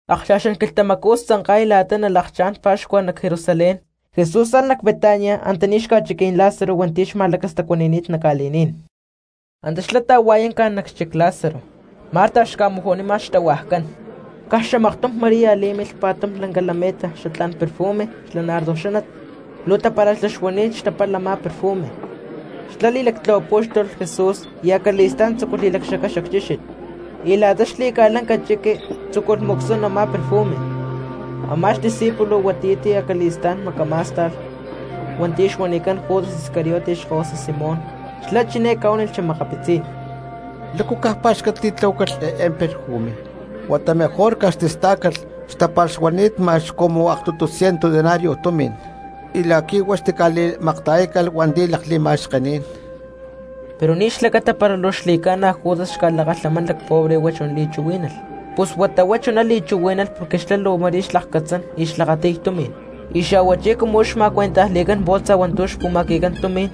Akcha̠xán quilhtamacú xtzanka̠y la̠ta nalakchá̠n pa̠xcua nac Jerusalén, Jesús alh nac Betania antaní xca̠chiquí̠n Lázaro hua̠nti̠ xma̠lacastacuani̠ni̠t nac ca̠li̠ní̠n. Antá xlá ta̠hua̠yánca nac xchic Lázaro, Marta xca̠maju̠nima xtahuajcán. Caj xamaktum María lí̠milh pa̠tum lanca lameta xatlá̠n perfume xla nardo xánat, luu tapara̠xlá xuani̠t xtapalh a̠má perfume; xlá li̠lactlahuapú̠xtulh Jesús y acali̠stá̠n tzúculh li̠lacxacay xacchíxit, y la̠ta xli̠ca̠lanca chiqui tzúculh mu̠csún a̠má perfume. Amá xdiscípulo huatiyá ti̠ acali̠stá̠n macamá̠sta̠lh hua̠nti̠ xuanicán Judas Iscariote xkahuasa Simón, xlá chiné ca̠huánilh xa̠makapitzí̠n: —¿Lácu caj pá̠xcat li̠tlahuácalh eé perfume? Huata mejor caj xtistá̠calh xtapalh xuani̠t ma̠x cumu aktutu ciento denario tumi̠n, y la̠qui̠ huá xtica̠li̠makta̠yácalh hua̠nti̠ lakli̠ma̠xkení̠n. Pero ni̠ xlacata para luu xli̠ca̠na Judas xca̠lakalhamán lacpobre huá chuná li̠chuhuí̠nalh, pus huata huá chuná li̠chuhuí̠nalh porque xlá luu ma̠rí xlakcatzán y xlakati̠y tumi̠n, y xa̠huachí cumu huá xma̠cuentajli̠cán bolsa hua̠ntu̠ xpu̠ma̠qui̠cán tumi̠n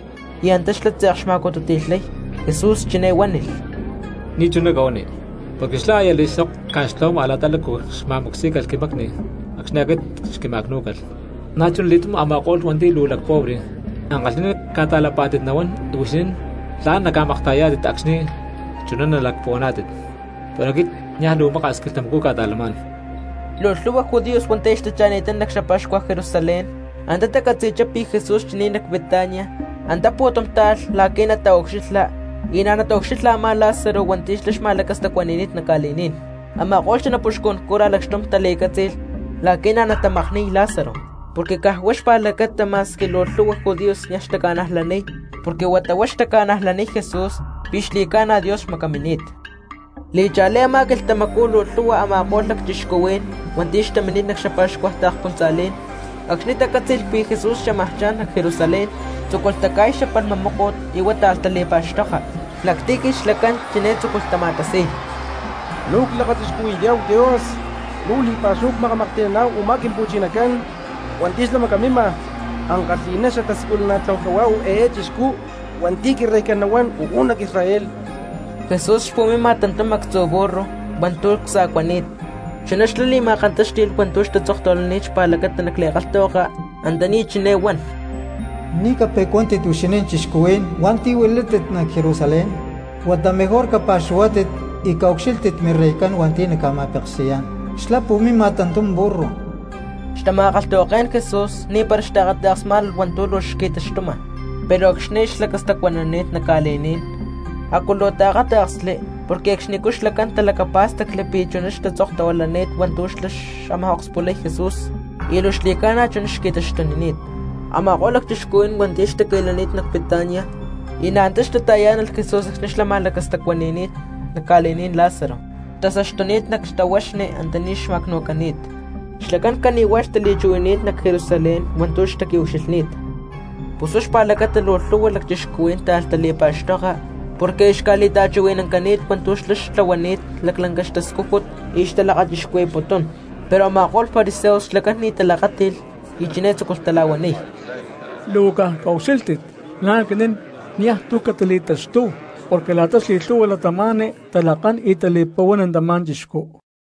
y antá xlá tze̠k xma̠cututi̠lhay. Jesús chiné huánilh: —Ni̠chuná cahuani, porque xlá aya a̠li̠sok ca̠xtlahuama la̠ta lácu xma̠mu̠csí̠calh quimacni acxni̠ aquit xquima̠cnú̠calh. Na̠chunali̠túm a̠ma̠ko̠lh hua̠nti̠ luu lacpobre, ankalhi̠ná ca̠ta̠lapá̠tit nahuán y huixinín tla̠n naca̠makta̠yayá̠tit acxni̠ chuná nalacpuhuaná̠tit, pero aquit niaj luu maka̠s quilhtamacú cca̠ta̠lamá̠n. Luu lhu̠hua judíos hua̠nti̠ aya xtacha̠ni̠ttá nac xapa̠xcua Jerusalén, antá tacatzi̠chá pi̠ Jesús xchini̠t nac Betania, antá pu̠tum táalh la̠qui̠ nataucxilha, y na̠ nataucxilha a̠má Lázaro hua̠nti̠ xlá xma̠lacastacuani̠ni̠t nac ca̠li̠ní̠n. Ama̠ko̠lh xanapuxcún cura lacxtum tali̠cátzi̠lh la̠qui̠ na̠ natamakni̠y Lázaro, porque caj huá xpa̠lacata ma̠squi luu lhu̠hua judíos niaj xtaca̠najlaniy porque huata huá xtaca̠najlaniy Jesús pi̠ xli̠ca̠na Dios xmacamini̠t. Li̠cha̠lí a̠má quilhtamacú luu lhu̠hua a̠ma̠ko̠lh cristianos hua̠nti̠ xtamini̠t nac xapa̠xcua taakspuntza̠lí̠n, acxni̠ tacátzi̠lh pi̠ Jesús xámaj cha̠n nac Jerusalén, tzúculh taca̠y xapalhma móko̠t y huá táalh tali̠pa̠xtoka. Nac tiji xlacán chiné tzúculh tama̠tasi̠y: —¡Luu clakachixcuhui̠yá̠hu Dios! ¡Luu li̠pa̠xúhu cmakamaklhti̠náhu u̠má Quimpu̠chinacán hua̠nti̠ xlá macamima! ¡Ankalhi̠ná xatasiculana̠tláhu cahuá eé chixcú hua̠nti̠ Quireycán nahuán uú nac Israel! Jesús xpu̠mima tantum actzu̠ burru hua̠ntu̠ csa̠cuani̠t, chuná xlá li̠ma̠kantáxti̠lh hua̠ntu̠ xtatzokni̠t xpa̠lacata nac li̠kalhtahuaka antaní chiné huán: Ni̠ cape̠cuántit huixinín cristianos hua̠nti̠ huilátit nac Jerusalén; huata mejor capa̠xuhuátit y caucxílhtit mireycán hua̠nti̠ naca̠ma̠peksi̠yá̠n, xlá pu̠mima tantum burru. Xtama̠kalhtahuaké̠n Jesús ni̠para xtaakata̠ksmá̠nalh hua̠ntu̠ luu xqui̠taxtuma, pero acxni̠ aya xlacastacuanani̠t nac ca̠li̠ní̠n a̠cu luu taakáta̠ksli porque acxnicú xlacán talacapá̠stacli pi̠ chuná xtatzoktahuilani̠t hua̠ntu̠ xlá xámaj okspulay Jesús, y luu xli̠ca̠na chuná xqui̠taxtunini̠t. Ama̠ko̠lh cristianos hua̠nti̠ xtaqui̠lani̠t nac Betania y na̠ antá xtata̠yá̠nalh Jesús acxni̠ xlá xma̠lacastacuani̠ni̠t nac ca̠li̠ní̠n Lázaro xtasaxtuni̠t nac xtahuaxni antaní xma̠cnu̠cani̠t, xlacán cani̠huá xtali̠chuhui̠nani̠t nac Jerusalén hua̠ntu̠ xtaqui̠ucxilhni̠t. Pus huá xpa̠lacata luu lhu̠hua cristianos táalh tali̠pa̠xtoka porque aya xca̠li̠ta̠chuhui̠nancani̠t hua̠ntu̠ xlá xtlahuani̠t lanca xtascújut y xtalakachixcuhui̠putún. Pero a̠ma̠ko̠lh fariseos xlacán ni̠ talakáti̠lh y chiné tzúculh tala̠huaniy: —Luu caj caucxílhtit la̠ aquinín niaj tu̠ catili̠taxtúhu, porque la̠ta xli̠lhu̠hua cristianos talakán y tali̠pa̠huán tamá chixcú.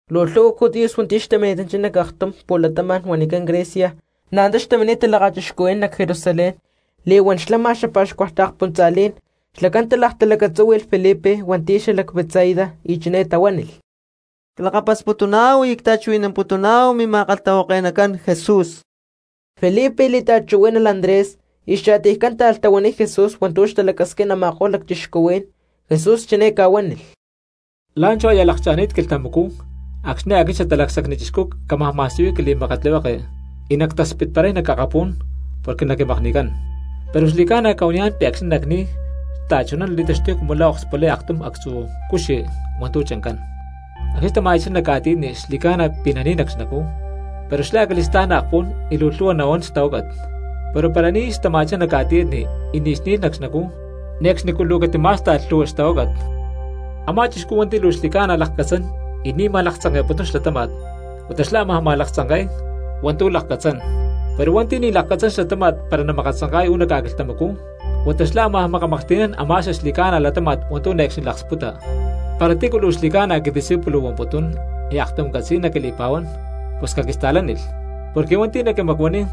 Luu lhu̠hua judíos hua̠nti̠ xtamini̠tanchá nac aktum pu̠latama̠n huanicán Grecia na̠ antá xtamini̠t talakachixcuhui̠nán nac Jerusalén li̠huán xlama xapa̠xcua taakspuntza̠lí̠n. Xlacán talaktalacatzúhui̠lh Felipe hua̠nti̠ xalac Betsaida y chiné tahuánilh: —Clakapasputuná̠hu y cta̠chuhui̠namputuná̠hu mima̠kalhtahuake̠nacán Jesús. Felipe li̠ta̠chuhuí̠nalh Andrés y xcha̠tiycán táalh tahuaniy Jesús hua̠ntu̠ xtalacasquín a̠ma̠ko̠lh lacchixcuhuí̠n. Jesús chiné ca̠huánilh: —La̠nchú aya lakcha̠ni̠t quilhtamacú acxni̠ aquit Xatalacsacni Chixcú cámaj ma̠siyuy quili̠makatlihueke y nactaspitparay nac akapú̠n porque naquimakni̠cán. Pero xli̠ca̠na cca̠huaniyá̠n pi̠ acxni̠ nacni̠y xta̠chuná nali̠taxtuy cumu la̠ okspulay aktum actzu̠ cuxi hua̠ntu̠ chancán, acxni̠ tama̠ya̠chá nac ca̠tiyatni xli̠ca̠na pi̠ nani̠y nac xnacú, pero xlá acali̠stá̠n naakpún y luu lhu̠hua nahuán xtahuácat. Pero para ni̠ xtama̠chá nac ca̠tiyatni y ni̠ xni̠lh nac xnacú, ne̠cxnicú luu catimá̠sta̠lh lhu̠hua xtahuácat. Amá chixcú hua̠nti̠ luu xli̠ca̠na lakcatzán y ni̠ makatzanka̠putún xlatáma̠t, huata xlá ámaj makatzanka̠y hua̠ntu̠ lakcatzán; pero hua̠nti̠ ni̠ lakcatzán xlatáma̠t para namakatzanka̠y uú nac ca̠quilhtamacú, huata xlá ámaj makamaklhti̠nán a̠má xaxli̠ca̠na latáma̠t hua̠ntu̠ ne̠cxni laksputa. Para tícu luu xli̠ca̠na quidiscípulo huamputún y aktum catzi̠y naquili̠pa̠huán, pus caquista̠lánilh; porque hua̠nti̠ naquimacuaniy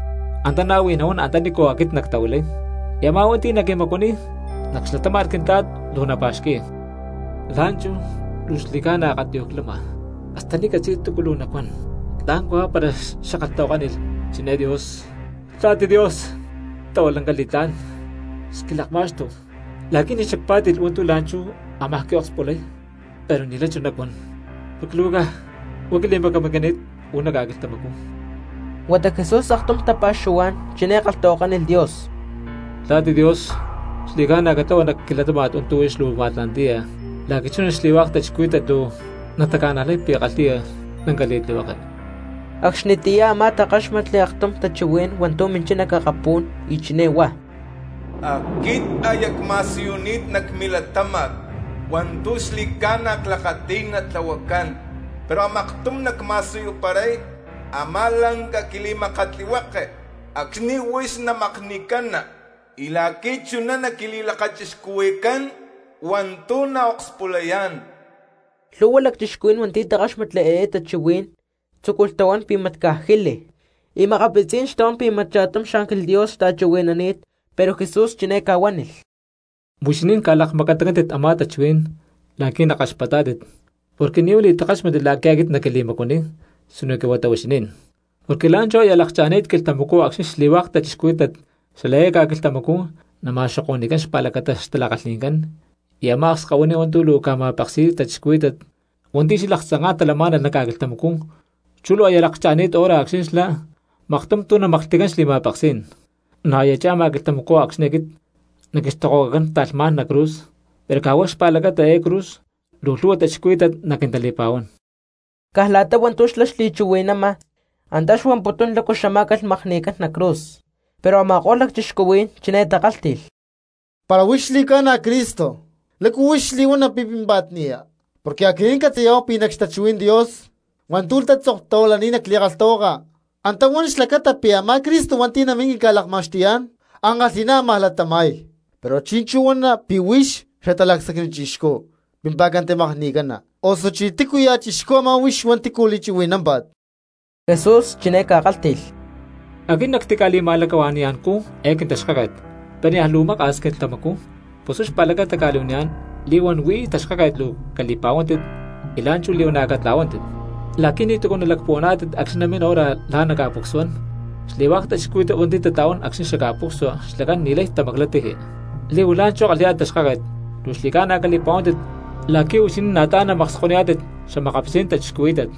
antá na̠ huij nahuán antanícu aquit nactahuilay, y a̠má hua̠nti̠ naquimacuaniy nac xlatáma̠t Quintla̠t luu napa̠xqui̠y. ’La̠nchú luu xli̠ca̠na akatiyuj clama, hasta ni̠ ccatzi̠y túcu luu nacuán. ¿Tla̠n cahuá para xackalhtahuakánilh chiné Dios: “Papá Dios, xtlahua lanca li̠tlá̠n, xquilakma̠xtu la̠qui̠ ni̠ xacpá̠ti̠lh hua̠ntu̠ la̠nchú ámaj quiokspulay”? Pero ni̠lay chuná nacuán porque luu caj huá quili̠macamini̠t uú nac ca̠quilhtamacú. Huata Jesús aktum tapa̠xuhuá̠n chiné kalhtahuakánilh Dios: —Papá Dios, xli̠ca̠na catlahua nac quilatáma̠t hua̠ntu̠ huix luu ma̠tla̠nti̠ya la̠qui̠ chuná xli̠hua̠k cristianos luu nataca̠najlay pi̠ kalhi̠ya lanca li̠tlihueke. Acxnitiyá a̠má takáxmatli aktum tachuhuí̠n hua̠ntu̠ minchá nac akapú̠n y chiné huá: —Aquit aya cma̠siyuni̠t nac milatáma̠t hua̠ntu̠ xli̠ca̠na clakati̠y natlahuacán, pero a̠maktum nacma̠siyuparay a̠má lanca quili̠makatlihueke acxni̠ huix namakni̠cana y la̠qui̠ chuná naquili̠lakachixcuhui̠cán hua̠ntu̠ naokspulayá̠n. Lhu̠hua cristianos hua̠nti̠ takáxmatli eé tachuhuí̠n tzúculh tahuán pi̠ mat caj jílilh, y makapitzí̠n xtahuán pi̠ mat cha̠tum xángel Dios xta̠chuhui̠nani̠t. Pero Jesús chiné ca̠huánilh: —Huixinín ca̠lakmacatancántit a̠má tachuhuí̠n la̠qui̠ nakaxpatá̠tit, porque ni̠ huá li̠takáxmatli la̠qui̠ aquit naquili̠macuaniy sinoque huata huixinín. Porque la̠nchú aya lakcha̠ni̠t quilhtamacú acxni̠ xli̠hua̠k cristianos xala eé ca̠quilhtamacú nama̠xoko̠ni̠cán xpa̠lacata xtala̠kalhi̠ncán, y a̠má akskahuiní hua̠nti̠ luu ca̠ma̠peksi̠y cristianos hua̠nti̠ xalaktzanká̠n talamá̠nalh nac ca̠quilhtamacú chú luu aya lakcha̠ni̠t hora acxni̠ xlá maktum tu̠ namaklhti̠cán xli̠ma̠peksí̠n. Na̠ aya lakcha̠ma quilhtamacú acxni̠ aquit naquixtokohuacacán ta̠lhmá̠n nac cruz, pero caj huá xpa̠lacata eé cruz luu lhu̠hua cristianos naquintali̠pa̠huán. Caj la̠ta hua̠ntu̠ xlá xli̠chuhui̠nama antá xuamputún lácu xamá̠calh makni̠cán nac cruz. Pero a̠ma̠ko̠lh cristianos chiné takálhti̠lh: —Para huix xli̠ca̠na Cristo, ¿lácu huix li̠huana pi̠ pímpa̠t ni̠ya? Porque aquinín ccatzi̠yá̠hu pi̠ nac xtachuhuí̠n Dios hua̠ntu̠ tatzoktahuilani̠t nac li̠kalhtahuaka antá huan xlacata pi̠ a̠má Cristo hua̠nti̠ namín quinca̠lakma̠xtuyá̠n ankalhi̠ná ámaj latama̠y. Pero chi̠nchú huana pi̠ huix Xatalacsacni Chixcú pimpa̠ca makni̠cana, osuchí ¿tícuya̠ chixcú a̠má hua̠nti̠ huix li̠chuhui̠námpa̠t? Jesús chiné ca̠kálhti̠lh: —Aquit nactica̠li̠ma̠lacahua̠ni̠ya̠ncú eé quintaxkáket pero niaj luu maka̠s quilhtamacú, pus huá xpa̠lacata cca̠li̠huaniyá̠n li̠huán huí taxkáket luu cali̠pa̠huántit y la̠nchú li̠huana̠ catla̠huántit, la̠qui̠ ni̠túcu nalacpuhuaná̠tit acxni̠ namín hora la̠ naca̠pucsuán, xli̠hua̠k cristianos hua̠nti̠ tatla̠huán acxni̠ ca̠pucsua xlacán ni̠lay tamaclay tiji. Li̠huán la̠nchú kalhi̠yá̠tit taxkáket, luu xli̠ca̠na cali̠pa̠huántit la̠qui̠ huixinín na̠ tla̠n naca̠makskoniyá̠tit xa̠makapitzí̠n minta̠cristianoscán.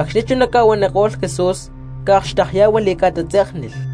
Acxni̠ chuná ca̠huaniko̠lh Jesús ca̠akxtekyá̠hualh y ca̠tatzé̠knilh.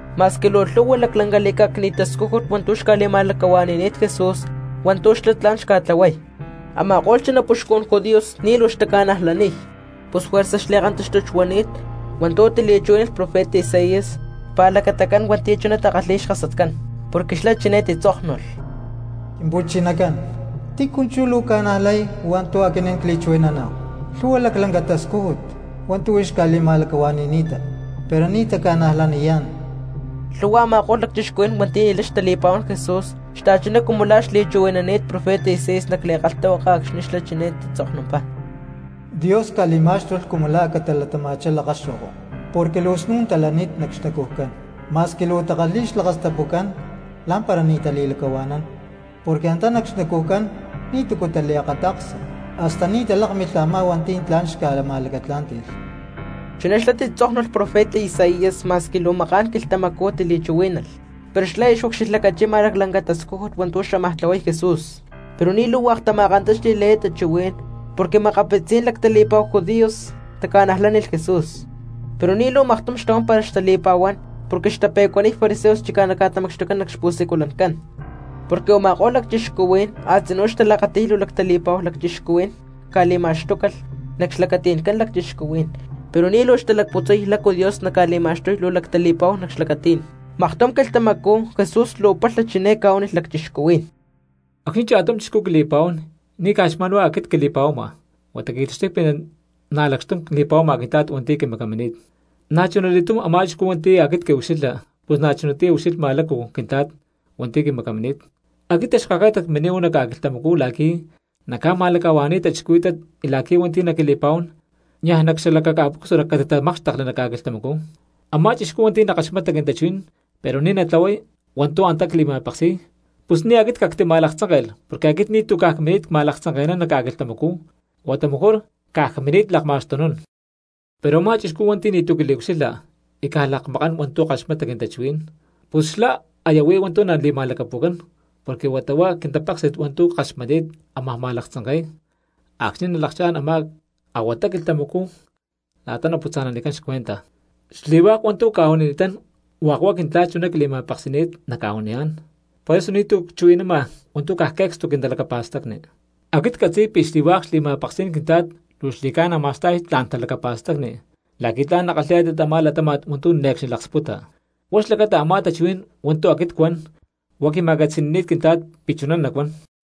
Ma̠squi luu lhu̠hua laclanca li̠cá̠cni̠t tascújut hua̠ntu̠ xca̠li̠ma̠lacahua̠ni̠ni̠t Jesús hua̠ntu̠ xlá tla̠n xca̠tlahuay, a̠ma̠ko̠lh xanapuxcun judíos ni̠ luu xtaca̠najlaniy. Pus juerza xli̠kantáxtut xuani̠t hua̠ntu̠ tili̠chuhuí̠nalh profeta Isaías xpa̠lacatacán hua̠nti̠ chuná takalhi̠y xkasatcán, porque xlá chiné titzóknulh: Quimpu̠chinacán, ¿tícu chú luu ca̠najlay hua̠ntu̠ aquinín cli̠chuhui̠naná̠hu? Lhu̠hua laclanca tascújut hua̠ntu̠ huix ca̠li̠ma̠lacahua̠ni̠ni̠ta, pero ni̠ taca̠najlaniyá̠n. Lhu̠hua a̠ma̠ko̠lh cristianos hua̠nti̠ ni̠lay xtali̠pa̠huán Jesús xta̠chuná cumu la̠ xli̠chuhui̠nani̠t profeta Isaías nac li̠kalhtahuaka acxni̠ xlá chiné tatzoknumpá: Dios ca̠li̠má̠xtulh cumu la̠ a̠ catalatama̠chá lakaxo̠ko, porque luu snu̠n talani̠t nac xnacujcán. Masqui luu takalhi̠y xlakastapucán lá̠mpara ni̠ tali̠lacahua̠nán, porque antá nac xnacujcán ni̠túcu taliakata̠ksa, hasta ni̠ talákmilh a̠má hua̠nti̠ tla̠n xca̠ma̠lacatlá̠nti̠lh. Chuná xlá titzóknulh profeta Isaías ma̠squi luu maká̠n quilhtamacú tili̠chuhuí̠nalh, pero xlá aya xucxilhlacachima laclanca tascújut hua̠ntu̠ xámaj tlahuay Jesús. Pero ni̠ luu hua̠k tama̠kantáxti̠lh eé tachuhuí̠n, porque makapitzí̠n lactali̠pa̠hu judíos taca̠najlánilh Jesús, pero ni̠ luu maktum xtahuán para xtali̠pa̠huán porque xtape̠cuaniy fariseos chicá naca̠tamacxtucán nac xpu̠siculancán. Porque u̠ma̠ko̠lh lacchixcuhuí̠n a̠tzinú xtalakati̠y luu lactali̠pa̠hu lacchixcuhuí̠n caca̠li̠ma̠xtúcalh nac xlacati̠ncán cristianos pero ni̠ luu xtalacputzay lácu Dios naca̠li̠ma̠xtuy luu lactali̠pa̠hu nac xlacatí̠n. Maktum quilhtamacú Jesús luu palha chiné ca̠huánilh cristianos: —Acxni̠ cha̠tum cristiano quili̠pa̠huán ni̠ caj xma̠n huá aquit quili̠pa̠huama, huata qui̠taxtuy pi̠ na̠ lacxtum li̠pa̠huáma Quintla̠t hua̠nti̠ quimacamini̠t. Na̠chunali̠túm a̠má cristiano hua̠nti̠ aquit quiucxilha pus na̠ chunatiyá ucxilhma lácu Quintla̠t hua̠nti̠ quimacamini̠t. Aquit taxkáket cmini̠t uú nac ca̠quilhtamacú la̠qui̠ nacca̠ma̠lacahua̠ni̠y cristianos y la̠qui̠ hua̠nti̠ naquili̠pa̠huán niaj nac xalakaca̠pucsua catitamákxtekli nac ca̠quilhtamacú. Amá cristiano hua̠nti̠ nakaxmata quintachuhuí̠n pero ni̠ natlahuay hua̠ntu̠ antá cli̠ma̠peksi̠y, pus ni̠ aquit cactima̠laktzánke̠lh porque aquit ni̠tu̠ caj cmini̠t ma̠laktzanke̠nán nac ca̠quilhtamacú, huata mejor caj cmini̠t lakma̠xtunún. Pero a̠má chixcú hua̠nti̠ ni̠tu̠ quiliucxilha y caj lakmakán hua̠ntu̠ kaxmata quintachuhuí̠n, pus xlá aya huí hua̠ntu̠ nali̠ma̠lacapu̠cán porque huata huá quintapéksi̠t hua̠ntu̠ kaxmatni̠t ámaj ma̠laktzanke̠y acxni̠ nalakchá̠n a̠má a̠huata quilhtamacú la̠ta naputza̠nanicán xcuenta. Xli̠hua̠k hua̠ntu̠ cca̠huanini̠tán hua̠k huá Quintla̠t chuná quili̠ma̠peksi̠ni̠t nacca̠huaniyá̠n, poreso ni̠tu̠ cchuhui̠nama hua̠ntu̠ caj que̠cstu quintalacapa̠stacni. Aquit ccatzi̠y pi̠ xli̠hua̠k xli̠ma̠peksí̠n Quintla̠t luu xli̠ca̠na ma̠sta̠y tla̠n talacapa̠stacni la̠qui̠ tla̠n nakalhi̠yá̠tit a̠má latáma̠t hua̠ntu̠ ne̠cxni laksputa, pus huá xlacata a̠má tachuhuí̠n hua̠ntu̠ aquit cuan huá quima̠catzi̠ni̠ni̠t Quintla̠t pi̠ chuná nacuán.